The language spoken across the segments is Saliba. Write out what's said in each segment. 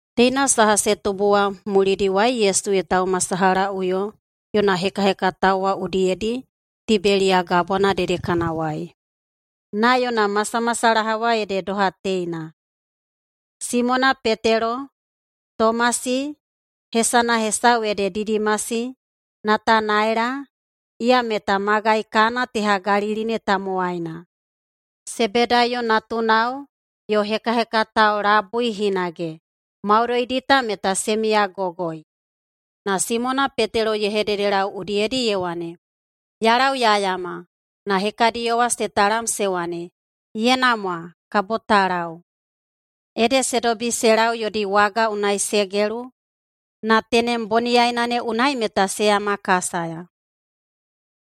Teina saha se tubu wa mulidiwai Yesu ye taumasalahaꞌuyo yona hekahekatao wa udiyedi Tibeliya Gabwana dedekanawai. Na yona masamasalaha wa ede doha teina: Simona Petelo, Tomasi, hesana hesau ede Didimasi, Natanaela, iya meta magai Kana teha Galili ne tamowaina, Sebedaiyo natunao yo hekahekatao labui hinage, maudoidi ta meta se miyagogoi. Na Simona Petelo ye hededelau udiyedi ye wane, “Ya lau ya yama.” Na hekadiyo wa se talam se wane, “[Ye namwa,] kabo ta lau.” Ede se dobi se lau yodi waga unai se gelu, na tenem boniyaina ne unai meta se yamakasaya.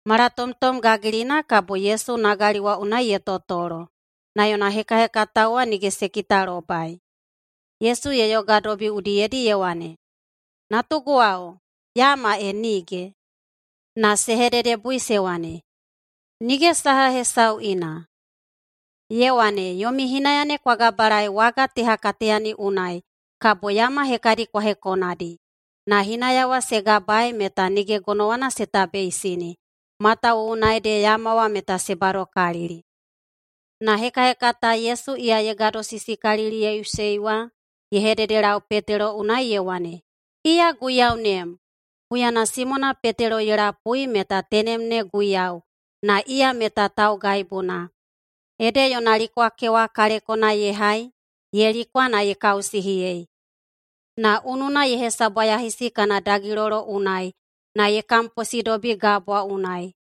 Malatomtom gagilina kabo Yesu nagali wa unai ye totolo, na yona hekahekatao wa nige se kitalobai. Yesu ye yogadobi udiyedi ye wane, “Natuguwao, yama e nige?” Na se hededebui se wane, “Nige saha hesau ina!” Ye wane, “Yomi hinaya ne kwa gabalaei waga teha kateyani unai, kabo yama hekadi kwa hekonadi.” Na hinaya wa se gabaei meta nige gonowana se tabeisini, matawuwuna ede yama wa meta se badokalili. Na hekahekata Yesu iya ye gadosisikaliliyeiꞌusei wa ye hededelau Petelo unai ye wane, “Iya Guiyaunem!” Huyana Simona Petelo ye lapui meta tenem ne Guiyau, na iya meta taugaibuna, ede yona likwakewa kalekona ye hai ye likwa na ye kausihiyei na ununa ye hesabwayahisi kana dagilolo unai, na ye kamposidobi gabwa unai.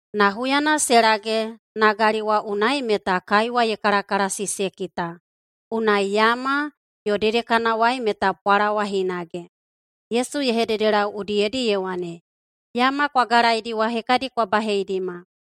Na huyana se lage nagali wa unai meta kaiwa ye kalakalasi se kita. Unai yama, yo dedekanawai meta pwalawa hinage. Yesu ye hededelau udiyedi ye wane, “Yama kwa galaidi wa hekadi kwa baheidima.”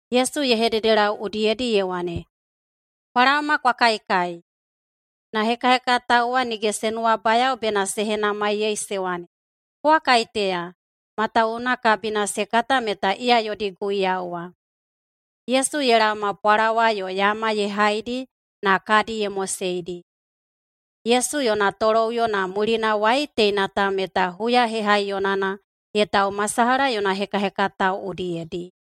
Yesu ye hededelau udiyedi ye wane, “Kwa laoma kwa kaikai!” Na hekahekatao wa nige se nuwabayao bena se henamaiyei se wane, “Kowa kaiteya?” Matawuwuna kabina se kata meta iya yodi Guiyau wa. Yesu ye laoma pwalawa yo yama ye haidi na kadi ye moseidi. Yesu yona toloꞌuyo na mulinawai teina ta meta huya hehaiyonana ye taumasalaha yona hekahekatao udiyedi.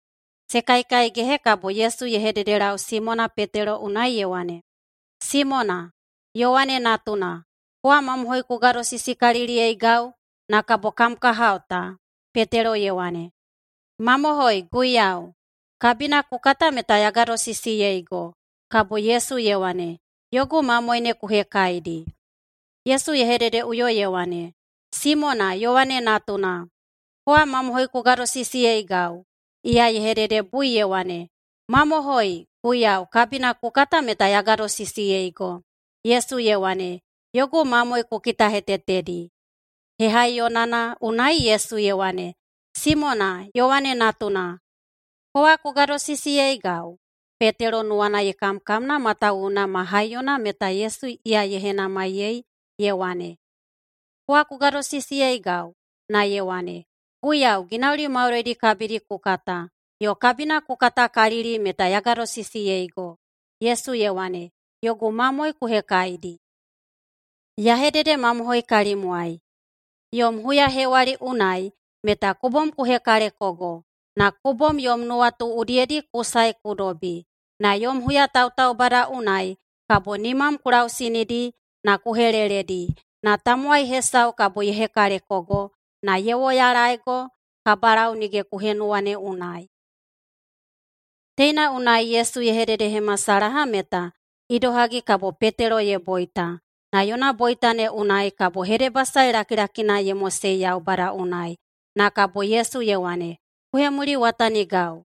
Se kaikaigehe kabo Yesu ye hededelau Simona Petelo unai ye wane, “Simona, Yowane natuna, kowa mamohoi ku gadosisikaliliyeigau, na kabo kam kahao ta?” Petelo ye wane, “Mamohoi, Guiyau, kabina ku kata meta ya gadosisiyeigo.” Kabo Yesu ye wane, “Yogu mamoe ne ku hekaidi.” Yesu ye hededeꞌuyo ye wane, “Simona, Yowane natuna, kowa mamohoi ku gadosisiyeigau?” Iya ye hededebui ye wane, “Mamohoi, Guiyau, kabina ku kata meta ya gadosisiyeigo.” Yesu ye wane, “Yogu mamoe ku kitahetetedi.” Hehaiyonana unai Yesu ye wane, “Simona, Yowane natuna, kowa ku gadosisiyeigau?” Petelo nuwana ye kamkamna, matawuwuna ma haiyona meta Yesu iya ye henamaiyei ye wane, “Kowa ku gadosisiyeigau?”, na ye wane, “Guiyau! Ginauli maudoidi kabidi ku kata, yo kabina ku katakalili meta ya gadosisiyeigo.” Yesu ye wane, “Yogu mamoe ku hekaidi. Ya hededemamohoi kalimwai: Yom huyahewali unai meta ku bom ku hekalekogo na ku bom yom nuwatu udiyedi ku sae ku dobi. Na yom huyatautaubada unai kabo nimam ku lausinidi na ku heleledi, na tamowai hesau kabo ye hekalekogo na ye woyalaeigo kabalau nige ku henuwa ne unai.” Teina unai Yesu ye hededehemasalaha meta idohagi kabo Petelo ye boita, na yona boita ne unai kabo hedebasae lakilakina ye mosei Yaubada unai. Na kabo Yesu ye wane, “Ku hemuliwatanigau!”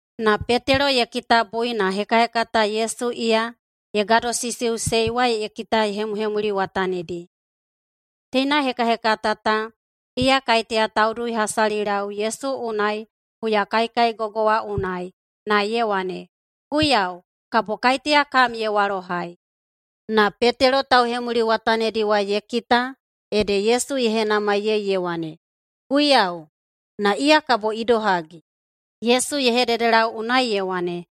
Na Petelo ye kitabui na hekahekata Yesu iya ye gadosisiꞌusei wa ye kita ye hemuhemuliwatanidi. (Teina hekahekata ta iya kaiteya tauduihasalilau Yesu unai huyakaikaigogo wa unai, na ye wane, “Guiyau, kabo kaiteya kam ye walohai?”) Na Petelo tauhemuliwatanidi wa ye kita ede Yesu ye henamaiyei ye wane, “Guiyau, na iya kabo idohagi?” Yesu ye hededelau unai ye wane,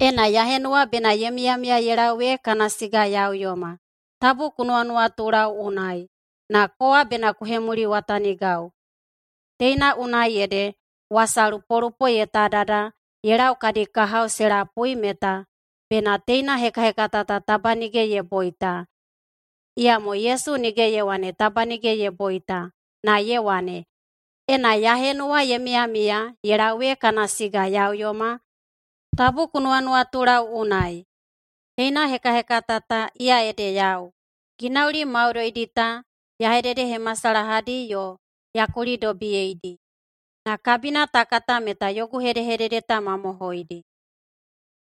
“Ena ya henuwa bena ye miyamiya ye lau ee kana siga ya uyoma, tabu ku nuwanuwatulau unai. Na kowa bena ku hemuliwatanigau.” Teina unai ede wasalupolupo ye tadada ye lau kadi kahao se lapui meta bena teina hekahekata ta taba nige ye boita. Iyamo Yesu nige ye wane taba nige ye boita, na ye wane, “Ena ya henuwa ye miyamiya ye lau ee kana siga ya uyoma, tabu ku nuwanuwatulau unai.” Teina hekahekata ta, iya ede yau. Ginauli maudoidi ta ya hededehemasalahadi yo ya kulidobiyeidi. Na kabina ta kata meta yogu hedehedede ta mamohoidi.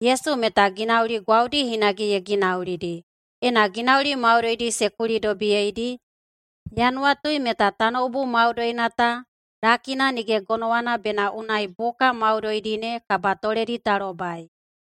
Yesu meta ginauli gwaudi hinage ye ginaulidi. Ena ginauli maudoidi se kulidobiyeidi, ya nuwatui meta tanoubu maudoina ta lakina nige gonowana bena unai buka maudoidi ne kabatoledi ta lobai.